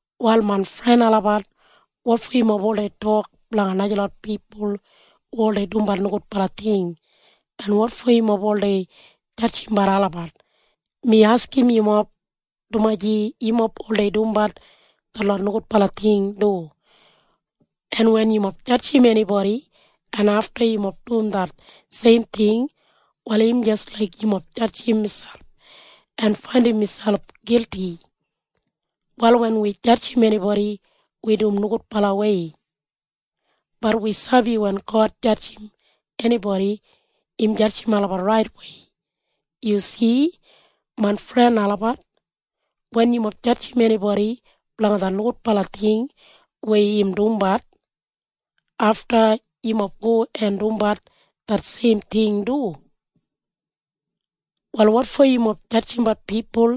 Wal main fren olabat, wotfo yumob oldei tok blanga najalot pipul hu oldei dumbat nogudbala ting, en wotfo yumob oldei jadjimbat olabat? Mi askim yumob, dumaji yumob oldei dumbat detlot nogudbala ting du. En wen yumob jadjim enibodi en afta yumob dum det seim ting, wal im jis laik yumob jadjim miselp en faindim miselp gilti. Wal wen wi jadjim enibodi, wi dum nogudbalawei. Bat wi sabi wen God jadjim enibodi, im jadjim olabat raitwei. Yu si, main fren olabat. Wen yumob jadjim enibodi blanga det nogudbala ting weya im dumbat, afta yumob go en dumbat det seim ting du. Wal wotfo yumob jadjimbat pipul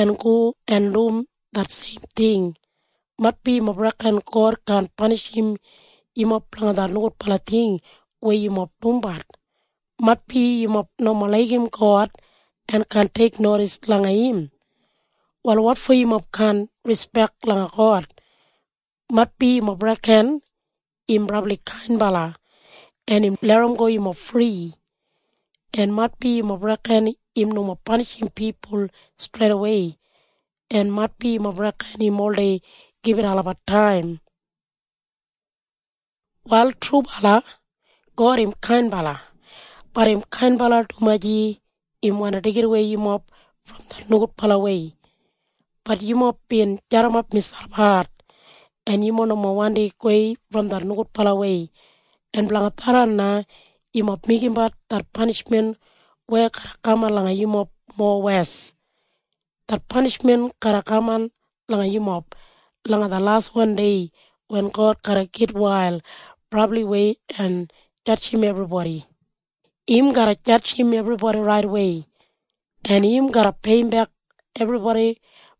en go en dum det seim ting? Maitbi yumob reken God kaan panishim yumob blanga det nogudbala ting weya yumob dumbat. Maitbi yumob nomo laigim God en kaan teiknodis langa im. Wal wotfo yumob kaan rispek langa God? Maitbi yumob reken im brabli kainbala en im larramgo yumob fri, en maitbi yumob reken im nomo panishim pipul streidawei, en maitbi yumob reken im oldei gibit olabat taim. Wal trubala, God im kainbala. Bat im kainbala dumaji im wandi deigidawei yumob brom det nogudbalawei. Bat yumob bin jadimap miselp hat, en yumob nomo wandi gowei brom det nogudbalawei, en blanga tharran na yumob meigimbat det panishmen weya garra kaman langa yumob mowes. Det panishmen garra kaman langa yumob langa det laswan dei wen God garra gitwail brabliwei en jadjim ebribodi. Im garra jadjim ebribodi raitwei, en im garra peiyimbek ebribodi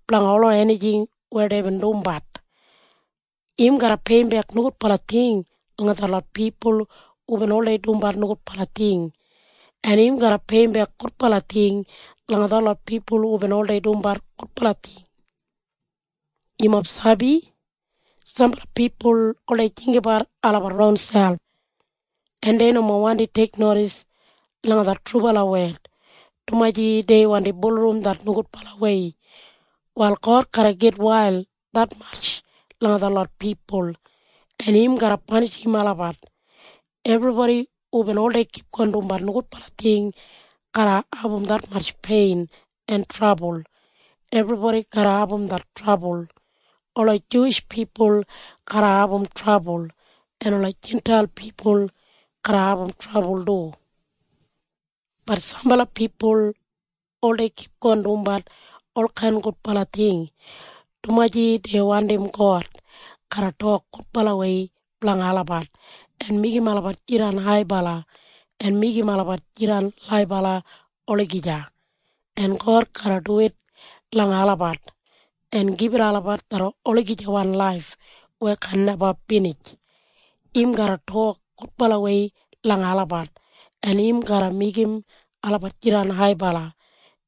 blanga ola enijing weya deibin dumbat. Im garra peiyimbek nogudbala ting langa detlot pipul hubin oldei dumbat nogudbala ting, en im garra peiyimbek gudbala ting langa detlot pipul hubin oldei dumbat gudbala ting. Yumob sabi? Sambala pipul oldei jinggabat olabat ronselp, en dei nomo wandi teiknodis langa det trubala wed, dumaji dei wandi bulurrum det nogudbalawei. Wal God garra gitwail detmatj langa detlot pipul, en im garra panishim olabat. Ebribodi hu oldei kipgon dumbat nogudbala ting garra abum detmatj pein en trabul. Ebribodi garra abum det trabul. Ola Juwish pipul garra abum trabul en ola Jintail pipul garra abum trabul du. Bat sambala pipul oldei kipgon dumbat olkain gudbala ting, dumaji dei wandim God garra tok gudbalawei blanga olabat en meigim olabat jidan haibala en meigim olabat jidan laibala olagija. En God garra duwit langa olabat en gibit olabat det olagijawan laif weya kaan neba binij. Im garra tok gudbalawei langa olabat, en im garra meigim olabat jidan haibala,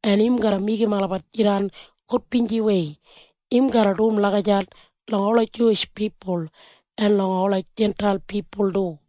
en im garra meigim olabat jidan gudbinjiwei. Im garra dum lagijat langa ola Juwish pipul en langa ola Jintail pipul du.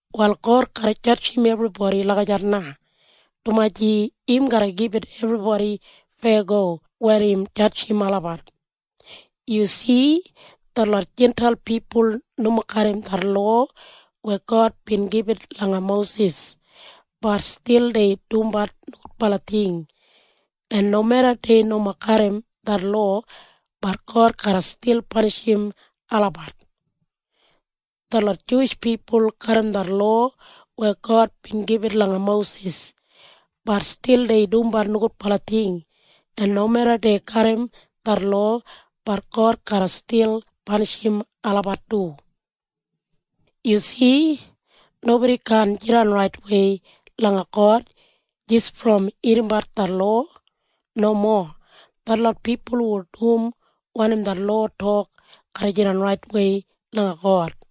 Wal God garra jadjim ebribodi lagijat na, dumaji im garra gibit ebribodi feyago wen im jadjim olabat. Yu si? Detlot Jintail pipul nomo garram det lowa weya God bin gibit langa Mosis, bat stil dei dumbat nogudbala ting, en nomeda dei nomo garram det lowa, bat God garra stil panishim olabat. Detlot Juwish pipul garram det lowa weya God bin gibit langa Mosis, bat stil dei dumbat nogudbala ting, en nomeda dei garram det lowa, bat God garra stil panishim olabat du. Yu si? Nobodi kaan jidan raitwei langa God jis brom irrimbat det lowa. Nomo. Detlot pipul hu dum wanim det lowa tok garra jidan raitwei langa God.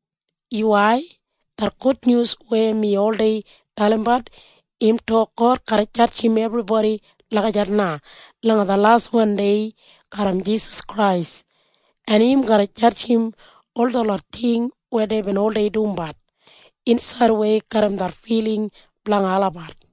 Yuwai. Det gudnyus weya mi oldei dalimbat, im tok God garra jadjim ebribodi lagijat na langa det laswan dei garram Jisas Krais, en im garra jadjim ol detlot ting weya deibin oldei dumbat insaidwei garram det filing blanga olabat.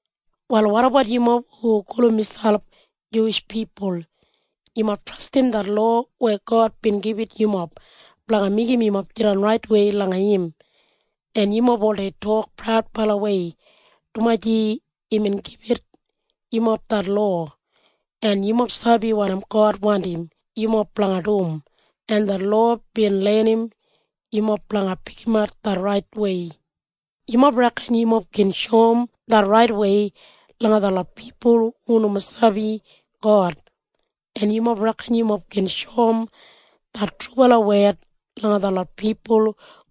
Wal wotabat yumob hu gulum miselp Juwish pipul? Yumob trastim det lowa weya God bin gibit yumob blanga meigim yumob jidan raitwei langa im, en yumob oldei tok praudbalawei dumaji imbin gibit yumob det lowa. En yumob sabi wanim God wandim yumob blanga dum, en det lowa bin lenim yumob blanga pikimat det raitwei. Yumob reken yumob gin shoum det raitwei langa detlot pipul hu nomo sabi God, en yumob reken yumob gin shoum det trubala wed langa detlot pipul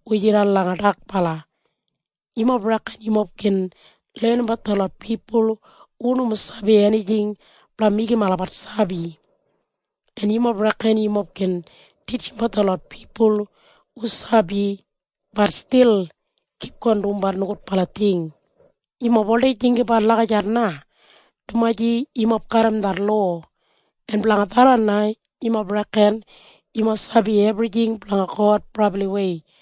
hu jidan langa dakbala. Yumob reken yumob gin lenimbat detlot pipul hu nomo sabi enijing blanga meigim olabat sabi, en yumob reken yumob gin titjimbat detlot pipul hu sabi, bat stil kipgon dumbat nogudbala ting. Yumob oldei jinggabat lagijat na dumaji yumob garram det lowa, en blanga tharran na yumob reken yumob sabi ebrijing blanga God brabliwei.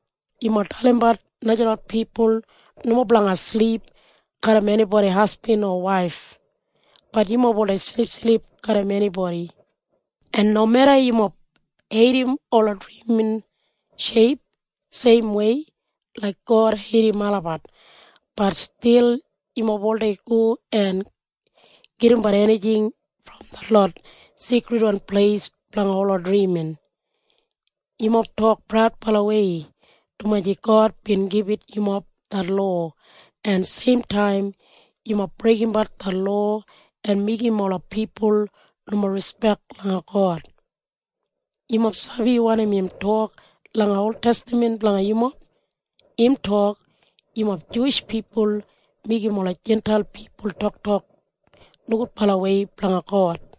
Yumob dalimbat najalot pipul nomo blanga silip garram enibodi hasbin o waif. Bat yumob oldei silipsilip garram enibodi. En nomeda yumob heidim ola drimin sheip seimwei laik God heidim olabat, bat stil yumob oldei go en gedimbat enijing brom detlot seikridwan pleis blanga ola drimin. Yumob tok praudbalawei dumaji God bin gibit yumob det lowa, en seimtaim yumob breigimbat det lowa en meigim ola pipul nomo rispek langa God. Yumob sabi wanim im tok langa oltestaman blanga yumob? Im tok, “Yumob Juwish pipul meigim ola Jintail pipul toktok nogudbalawei blanga God.”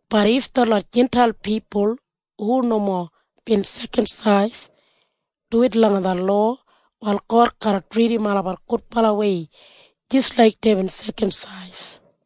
Bat if detlot Jintail pipul hu nomo bin sekamsais duwit langa det lowa, wal God garra tridim olabat gudbalawei jis laik deibin sekamsais.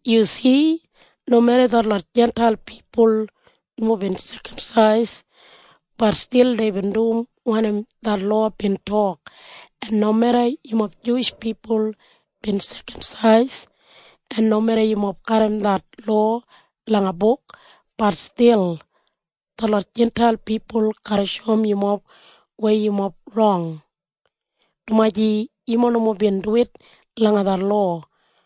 Yu si? Nomeda detlot Jintail pipul nomo bin sekamsais, bat stil deibin dum wanim det lowa bin tok. En nomeda yumob Juwish pipul bin sekamsais en nomeda yumob garram det lowa langa buk, bat stil detlot Jintail pipul garra shoum yumob weya yumob rong, dumaji yumob nomo bin duwit langa det lowa.